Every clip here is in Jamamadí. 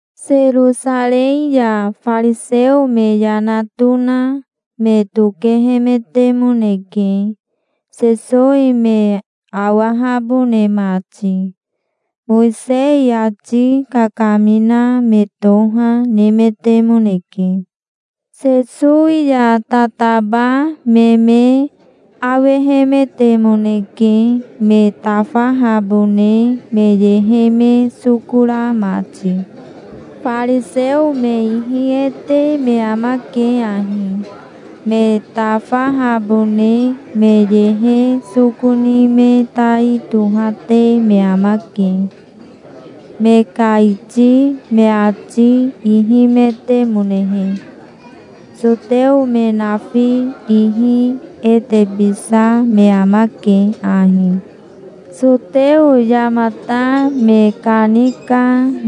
Serosarei ya fariseo me yana tona me tokehemetemoneke, Sesowi me awahabone mati. Mowisei ati kakamina me toha, nemetemoneke. Sesowi ya tataba me me awehemetemoneke, me tafahabone me yehe me soko ra mati. Fariseo me ihi e te me amake ahi: Me tafahabone me yehe soko ni me tai tohate me amake, me ka iti me ati ihimetemonehe. Soteo me nafi ihi e tebisa me amake ahi. Soteo yamata me kanika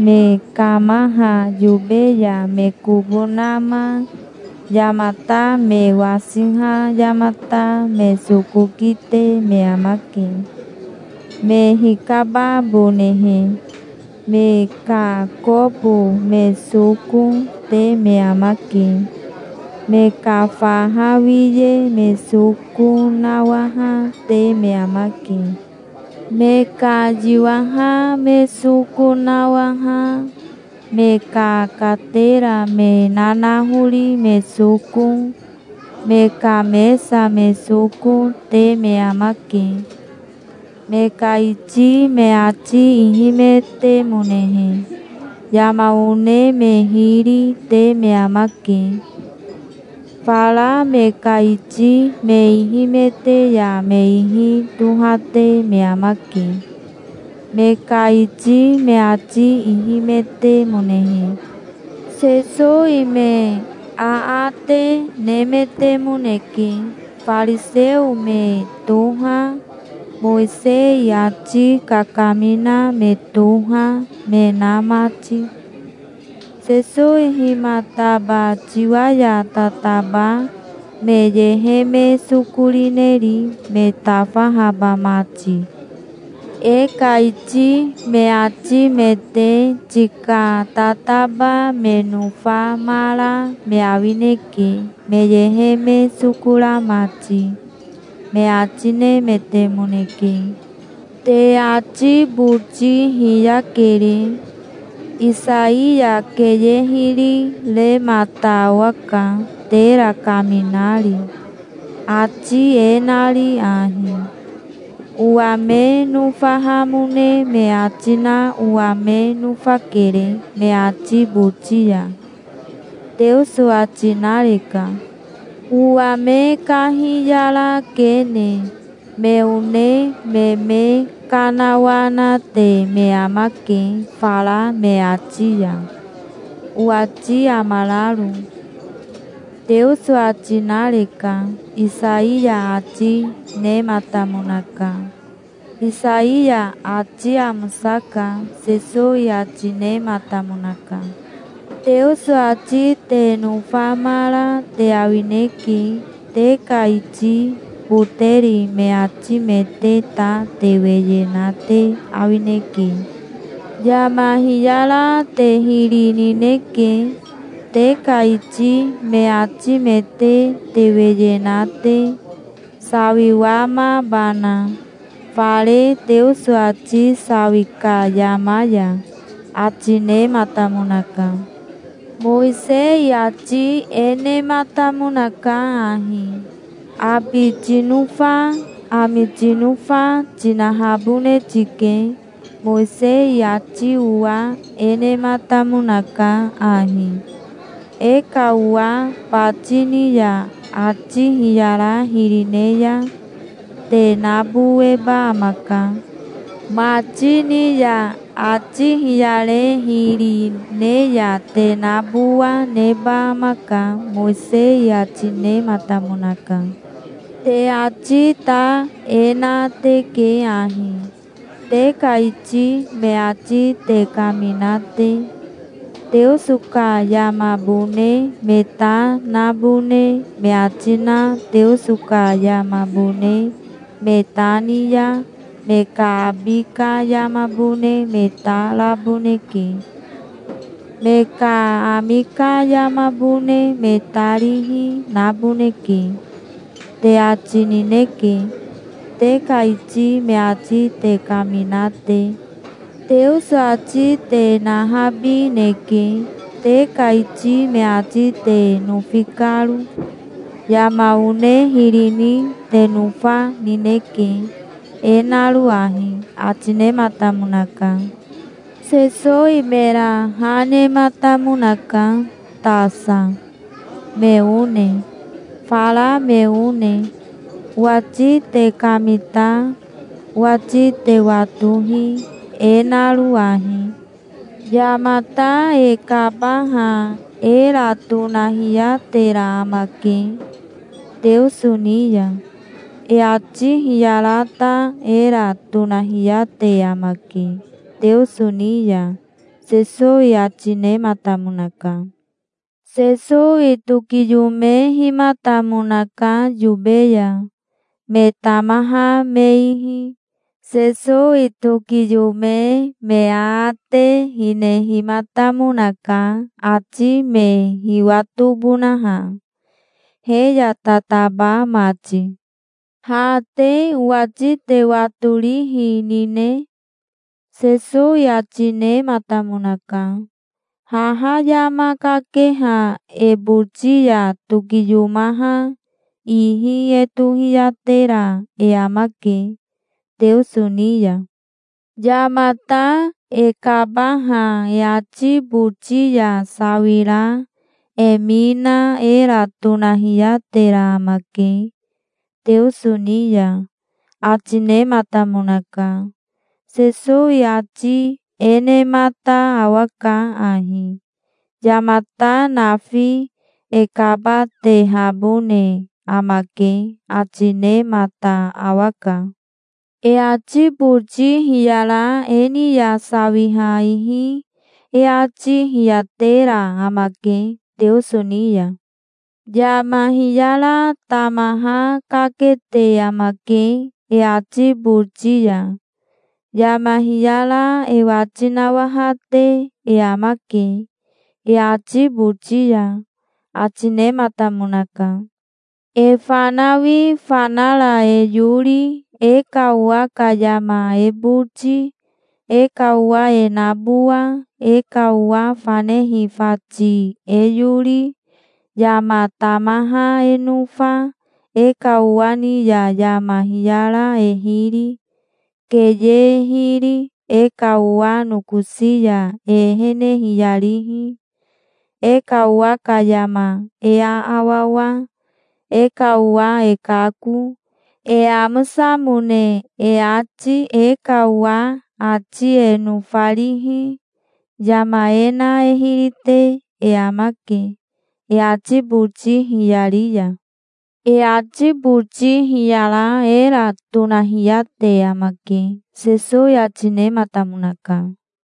me kamaha yobe ya me kobo nama yamata me wasiha yamata me soko kite me amake, me hikababonehe. Me ka kobo me soko, te me amake. Me ka faha wiye me soko nawaha, te me amake. Me ka yiwaha me soko nawaha, me ka katera me nanahori me soko, me ka mesa me soko, te me amake, me ka iti me ati ihimetemonehe. Yama one me hiri, te me amake. Fara me ka iti me ihimete ya me ihi tohate me amake, me ka iti me ati ihimetemonehe. Sesowi me aate nemetemoneke, fariseo me toha, Mowisei ati kakamina me toha, me na mati. "Sesowi himataba tiwa ya tataba me yehe me soko rineri, me tafahaba mati? E ka iti me atimete tika tataba me nofamara me awineke, me yehe me soko ra mati", me ati nemetemoneke. "Te ati boti hiyakere. Isaiya keye hiri remata awaka, tera kaminari, ati e nari ahi: 'Owa me nofahamone me ati na owa me nofakere me ati boti ya', Teoso ati nareka. "Owa me kahiyara kene. Me one me me kanawanate me amake fara me ati ya, owati amararo", Teoso ati nareka', Isaiya ati nematamonaka. Isaiya ati amosaka", Sesowi ati nematamonaka. "Teoso ati te nofamara te awineke. Te ka iti boteri me atimete ta te weye na te awineke. Yama hiyara te hiri nineke, te ka iti me atimete te weye na te, sawiwamabana, fare Teoso ati sawi ka yama ya", ati nematamonaka. "Mowisei ati e nematamonaka ahi: 'Abi tinofa, ami tinofa, tinahabone tike'. Mowisei ati owa e nematamonaka ahi: 'E ka owa bati ni ya ati hiyara hiri ne ya te naboweba amaka. Mati ni ya ati hiyare hiri, ne ya te nabowa neba amaka', Mowisei ati nematamonaka. Te ati ta e na teke ahi, te ka iti me ati te kamina te: 'Teoso ka yamabone me ta nabone me ati na Teoso ka yamabone me ta ni ya me ka abi ka yamabone me ta raboneke. Me ka ami ka yamabone me ta rihi naboneke', te ati nineke, te ka iti me ati te kamina te. Teoso ati te nahabineke, te ka iti me ati te nofi karo. Yama one hiri ni te nofa nineke, e naro ahi", ati nematamonaka. Sesowi mera ha nematamonaka, tasa, me one, fara me one. "Owati te kamita. Owati te watohi, e naro ahi: Yamata e kabaha era tonahiyatera amake, Teoso ni ya. E ati hiyara ta era tonahiyate amake, Teoso ni ya", Sesowi ati nematamonaka. Sesowi tokiyomehimatamonaka yobe ya, me tamaha me ihi. Sesowi tokiyome me aate hinehimatamonaka, ati me hiwatobonaha, he ya tataba mati. "Ha te owati te watorihi nine?" Sesowi ati nematamonaka. "Haha yama kakeha e boti ya tokiyomaha ihi e tohiyatera e amake, Teoso ni ya. Yamata e kabaha e ati boti ya sawira e mi na era tonahiyatera amake, Teoso ni ya", ati nematamonaka. Sesowi ati e nemata awaka ahi: Yamata nafi e kabatehabone amake, ati nemata awaka. "E ati boti hiyara e ni ya sawiha ihi e ati hiyatera amake, Teoso ni ya. Yama hiyara tamaha kakete amake e ati boti ya. Yama hiyara e wati nawahate e amake e ati boti ya", ati nematamonaka. "E fanawi fanara e yori, e ka owa ka yama e boti, e ka owa e nabowa, e ka owa fanehi fati e yori, yama tamaha e nofa, e ka owa ni ya yama hiyara e hiri, keye e hiri, e ka owa nokosi ya e ehene hiyarihi, e ka owa ka yama e aawawa, e ka owa e kako, e amosamone e ati, e ka owa ati e nofarihi, yama e na e hiri te e amake, e ati boti hiyari ya. E ati boti hiyara era tonahiyate amake", Sesowi ati nematamonaka.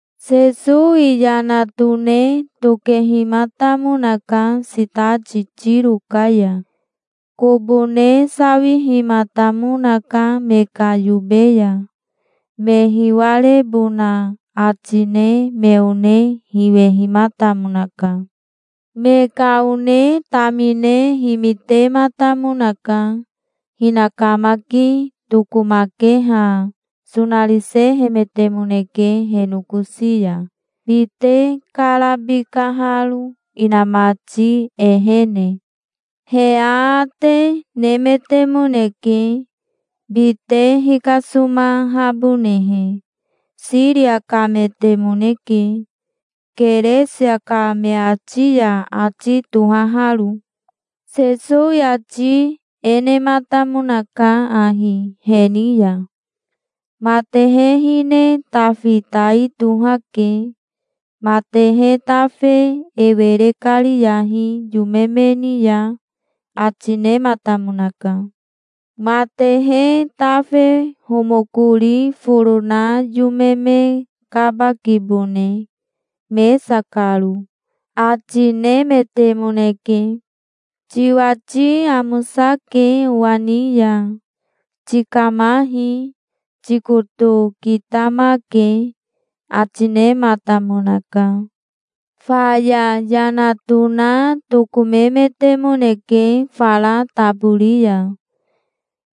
Sesowi yana tone tokehimatamonaka sitati Tiro ka ya. Kobo ne sawihimatamonaka me ka yobe ya. Me hiwarebona ati ne me one hiwehimatamonaka. Me ka one tamine himitematamonaka. Hinakamaki tokomakeha sonarisehemetemoneke he nokosi ya, bite karabikaharo, inamati ehene. He aate nemetemoneke, bite hikasomahabonehe. Siria kametemoneke, Keresia ka me ati ya ati tohaharo. Sesowi ati e nematamonaka ahi he ni ya: "Matehe hine tafi tai tohake. Matehe tafe e were kariyahi yome me ni ya", ati nematamonaka. "Matehe tafe homokori foro na yome me kaba kibone, mesa karo", ati nemetemoneke. "Tiwati amosake owa ni ya. Tikamahi. Tikoto kitamake", ati nematamonaka. Faya yana tona tokomemetemoneke fara tabori ya.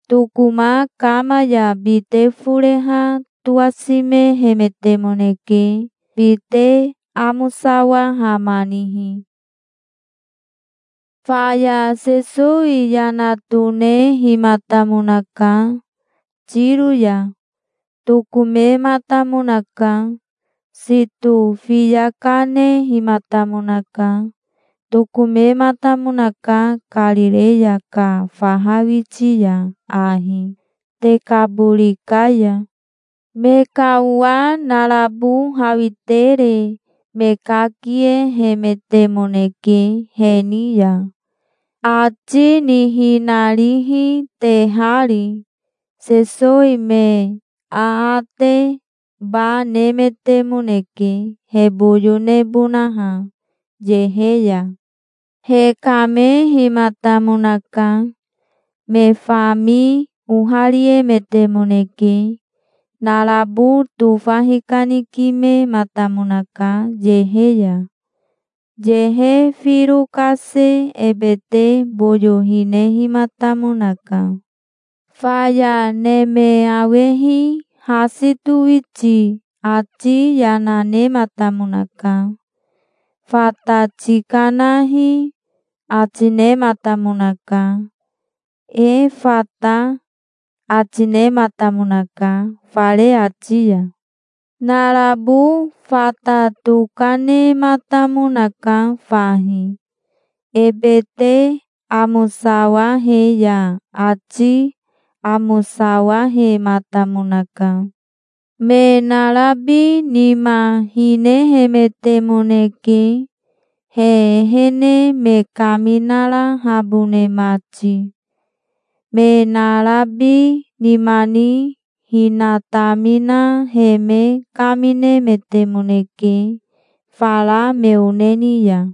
Tokoma kama ya bite foreha towasimehemetemoneke bite amosawahamanihi. Faya Sesowi yana tonehimatamonaka Tiro ya. Tokomematamonaka. Sito fiya kanehimatamonaka. Tokomematamonaka Karireya ka faha witi ya ahi, Tekabori ka ya. Me ka owa narabo hawitere me kakiehemetemoneke he ni ya, ati nihinarihi tehari. Sesowi me aate ba nemetemoneke, he boyo nebonaha, yehe ya. Hekamehimatamonaka. Me fami ohariemetemoneke. Narabo tofa hikanikimematamonaka yehe ya. Yehe firo kase ebete boyo hinehimatamonaka. Faya neme awehi hasi towiti ati yana nematamonaka. "Fata tikanahi", ati nematamonaka. "Efata", ati nematamonaka, fare ati ya. Narabo fata tokanematamonaka fahi. Ebete amosawahe ya ati amosawahematamonaka. Me narabi nima hinehemetemoneke, he ehene me kaminarahabone mati. Me narabi nima ni hinatamina he me kaminemetemoneke fara me one ni ya.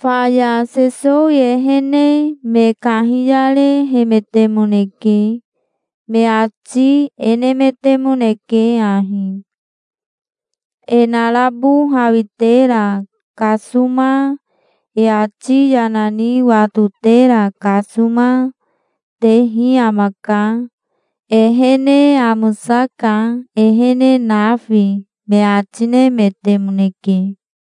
Faya Sesowi ehene me kahiyarehemetemoneke. Me ati e nemetemoneke ahi: "E narabo hawitera kasoma, e ati yana ni watotera kasoma, tehi amaka. Ehene amosaka, ehene nafi", me ati nemetemoneke.